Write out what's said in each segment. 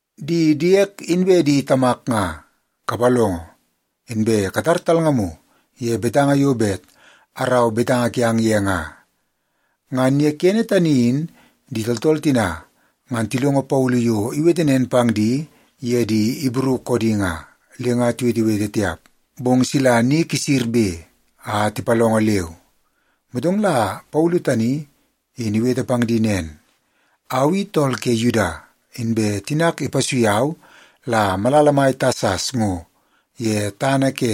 “Di diek inbe di tamak nga, kapalongo. Inbe katar talngamu ye betanga yo bet arau betanga kiang ye nga.” Ngan ye kene tani in di tooltool tina ngan tilongo Paulu yo iwete nen pang di ye di Ibru koodi nga, le nga tiwetewete tiap, bong sila ni kisirbe a tipalongo leu. Motong la Paulu tani in iwete pang di nen, “Au i tool ke Yuda, inbe tinak ipasui au la malala mai Tasas ngo ye tana ke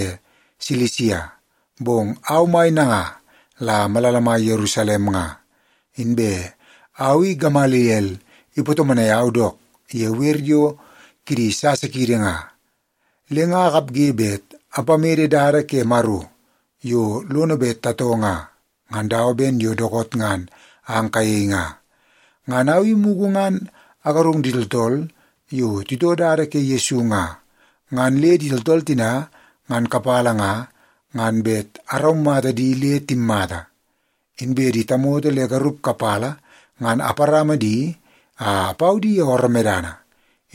Silisia, bong au mai nanga la malala mai Yerusalem nga. Inbe au i Gamaliel ipatomonai au dook ye wer yo kidi sasa kiidi nga, le nga akapge bet apamede dada ke Maro yo lono bet tatoo nga, ngan dawa ben yo dookoot ngan ang kayei nga. Ngan au i mugu ngan agarung di tooltool yo titoo Dada ke Yesu nga, ngan le di tooltool tina ngan kapala nga, ngan bet araumata di le timmata. Inbe di tamoto le garup kapala ngan aparama di a apau di ye ooroo medana,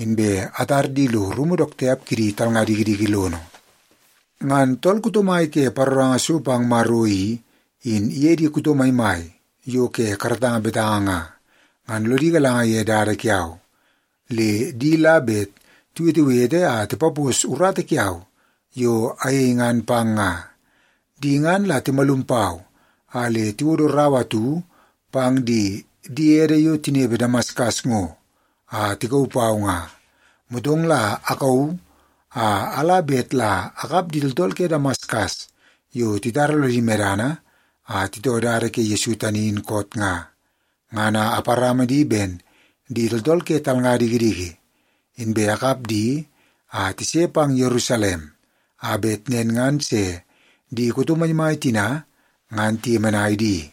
inbe atar di lo rumu dook tiap kidi talnga dikidiki lono. Ngan tool kuto mai ke paroranga so pang Maro i, in iye di kuto maimai yo ke karatanga betanga nga, ngan lodi galanga ye dada kiau, le di la bet tiwetewete a tipapos urata kiau yo ayei ngan pang nga. Di ngan la timalum pau a le tiwodo rau atu pang di diede yo tinepe Damaskas ngo a tikauu pau nga. Motong la akauu a ala bet la akap di tooltool ke Damaskas yo titara lodi medana a titoo Dada ke Yesu tani in koot nga, ngan a aparama di ben di tooltool ke talnga dikidiki, inbe akap di a tise pang Yerusalem, a bet nen ngan se di kuto maimai tina ngan tiyemenai di.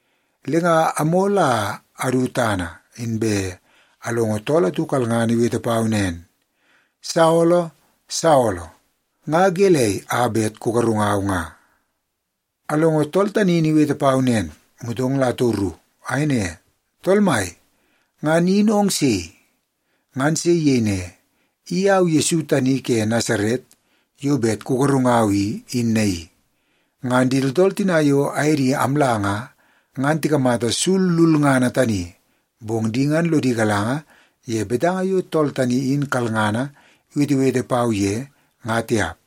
Le nga amol a adu tana, inbe alongo tool atu kalngana iwete pau nen, ‘Saolo! Saolo! Nga gelei a bet kugarungau nga?’ “Alongo tool tani in iwete pau nen, motong la atoru. Ayei ne, ‘Tool Mai, ngan in ong sei?’ “Ngan se iyei ne, ‘I au Yesu tani ke Nasaret yo bet kugarungau i, in naii.’ Ngan di tooltool yo aye di amla nga, ngan tikamata sul lulngana tani, bong di ngan lodi galanga ye betanga yo tool tani in kalngana iwetewete pau ye, nga tiap.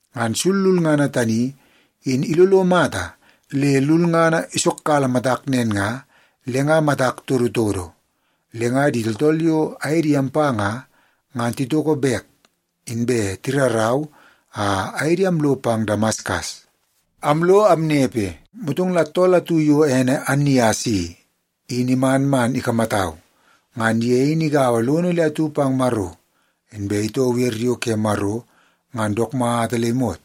Ngan sul lulngana tani in ilolo mata le lulngana isokkala matak nen nga, le nga matak todotodo. Le nga di tooltool yo aye di ampa nga, ngan titoko bek, inbe tirarau a aye di amlo pang Damaskas. “Amlo amnepe, motong la tool atu yo ene Annias i, in iman man ikamatau. Ngan ye in igaua lono le atu pang Maro, inbe itoo wer yo ke Maro ngan dook mata le imot.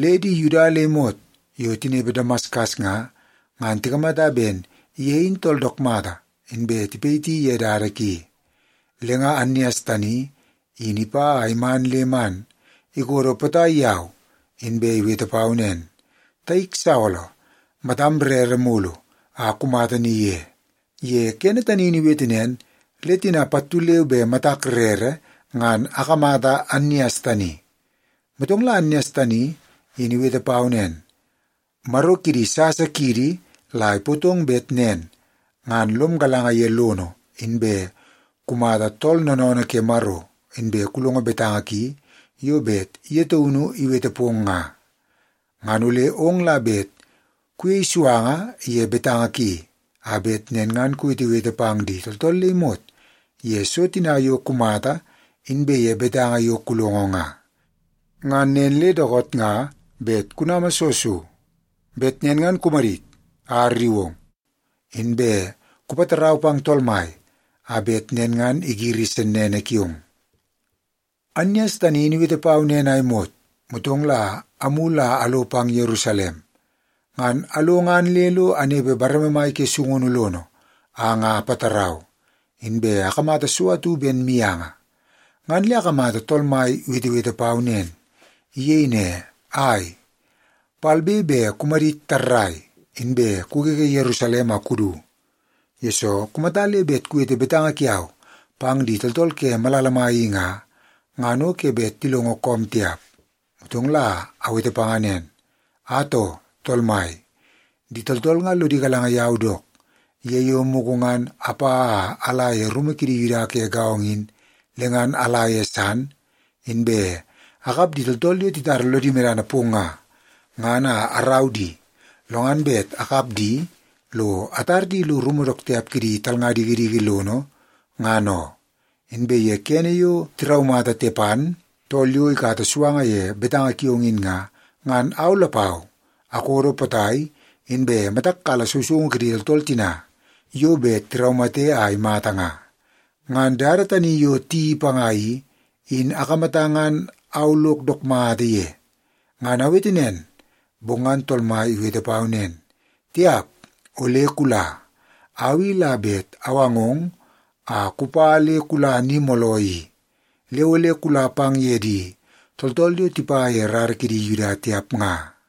Le di Yuda le imot yo tinepe Damaskas nga, ngan tikamata ben ye in tool dook mata, inbe tipayiti ye dada ki. Le nga Annias tani in ipa a iman le man ikodo potai yau, inbe iwete pau nen, ‘Taik Saolo, matam rere mulu a kumata ni ye.’ Ye kene tani in iwete nen, le tina pattu leu be matak rere ngan akamata Annias tani. “Motong la Annias tani in iwete pau nen, ‘Maro kidi sasa kiidi la ipootong bet nen ngan lom galanga ye lono, inbe kumata Tool Noonoonoo ke Maro, inbe kulongo betanga ki yo bet ye taunu iwete pong nga. Ngan ole ong la bet kuyei suanga ye betanga ki, a bet nen ngan kuwetewete pang di tooltool le imot ye so tina yo kumata inbe ye betanga yo kulongo nga. Ngan nen le dookoot nga bet kunama soo so? Bet nen ngan kumadit a arriu ong, inbe kupatarau pang Tool Mai a bet nen ngan igiri sennene kiong.’ “Annias tani in iwete pau nen a imot, motong la amulu a alo pang Yerusalem. Ngan alo ngan le lo anepe bareme mai ke sungunu lono a nga apatarau, inbe akamata so atu ben mianga, ngan le akamata Tool Mai iwetewete pau nen. Iyei ne, ‘Ai, palbe be kumadit tarrai, inbe kugege Yerusalem a kudu. Yesoo, kumata le bet kuwete betanga kiau pang di tooltool ke malala mai i nga, ngan o ke bet tilongo koom tiap.’ “Motong la awete panga nen, ‘Atoo, Tool Mai, di tooltool nga lodi galanga yau dook, ye yo mugu ngan apa a ala ye rumu kidi Yuda ke gaongo in, le ngan ala ye san, inbe akap di tooltool yo titara lodi medana pong nga, ngan a arau di, lo ngan bet akap di lo atar di lo rumu dook tiap kidi talnga dikidiki lono, ngan oo. Inbe ye kene yo tiraumata Tepan, tool yo ikata suanga ye betanga kiong in nga, ngan au lapau akodo potai, inbe matak kala sousoungu kidi tooltool tina yo bet tiraumate a imata nga. Ngan dada tani yo tiyeii panga i, in akamata ngan au lok dook mata ye.’ “Ngan awete nen, bong ngan Tool Mai iwete pau nen, ‘Tiap, ole kula. Au i la bet awangong a kupa le kula ni mooloo i. Le ole kula pang ye di tooltool yo tipa ye rara kidi Yuda tiap nga.’”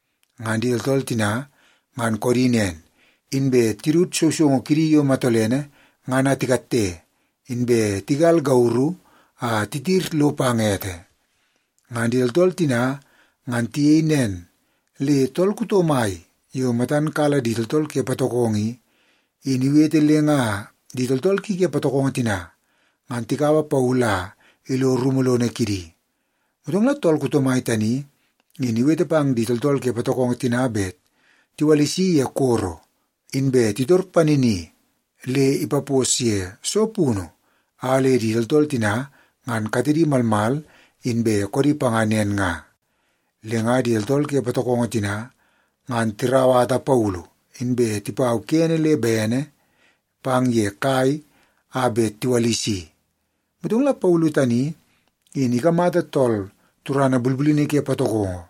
Ngan di tooltool tina ngan koodi nen, inbe tidut sousoungu kidi yo matolene ngan a tikatte, inbe tigal gauru a titir lo pang ete. Ngan di tooltool tina ngan tiyei nen, le tool kuto mai yo matan kala di tooltool ke patokongo i, in iwete le nga di tooltool ki ke patokongo tina ngan tikaua Paulu a ilo rumu lono kidi. Motong la tool kuto mai tani in iwete pang di tooltool ke patokongo tina bet tiwalisi ye koro, inbe titor panini le ipapos ye soo punu a le di tooltool tina ngan katedi malmal inbe koodi panga nen nga. Le nga di tooltool ke patokongo tina, ngan tirauwata Paulu, inbe tipau kene le bene pang ye kai a bet tiwalisi. Motong la Paulu tani in ikamata tool turana bulbulini ke patokongo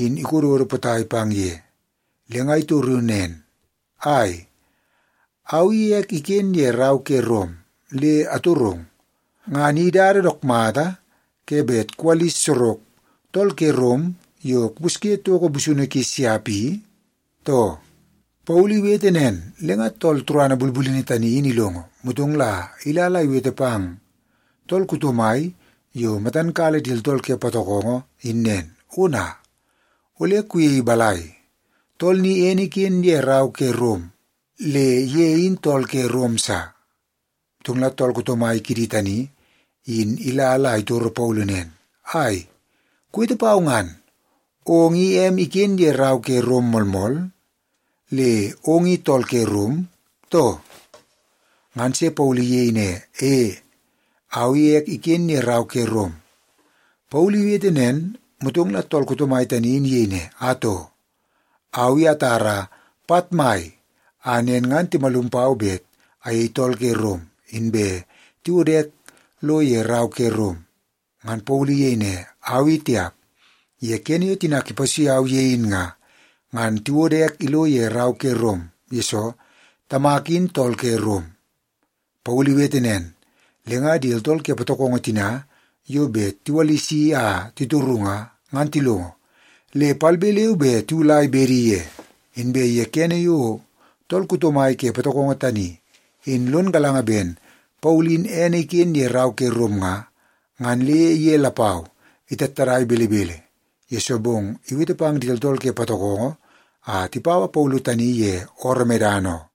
in ikododo potai pang ye, le nga itoru nen, “Ai, au i ek iken ye rau ke Rom. Le atorong, ngan i dada dook mata ke bet kuwalis sorok tool ke Rom yo kupusye toko busunu ki siap i, too?” Paulu iwete nen, le ngan tool turana bulbulini tani in ilongo, motong la ila la iwete pang tool kuto mai yo matan kala di tooltool ke patokongo in nen, “Ona, ole kuyei balai? Tool ni ene iken ye rau ke Rom le ye in tool ke Rom sa.” Motong la tool kuto mai kidi tani in ila la itoro Paulu nen, “Ai, kuwete pau ngan. Ong i em iken ye rau ke Rom moolmool, le ong i tool ke Rom, too?” Ngan se Paulu iyei ne, “E, au i ek iken ye rau ke Rom.” Paulu iwete nen, motong la tool kuto mai tani in iyei ne, “Atoo, au i atara pat mai a nen ngan timalum pau bet ayei tool ke Rom inbe tiwodo ek lo ye rau ke Rom.” Ngan Paulu iyei ne, “Au i tiap. Ye kene yo tinak ipasui au ye in nga, ngan tiwodo ek ilo ye rau ke Rom, yesoo tamak in tool ke Rom.” Paulu iwete nen, le nga di tooltool ke patokongo tina yo bet tiwalisi a titoru nga, ngan tilongo, le palbe leu be tiwulai bedi ye. Inbe ye kene yo tool kuto mai ke patokongo tani in lon galanga ben Paulu in ene iken ye rau ke Rom nga, ngan le ye lapau itattadai belebele, yesoo bong iwete pang di tooltool ke patokongo a tipaua Paulu tani ye ooroo medana oo.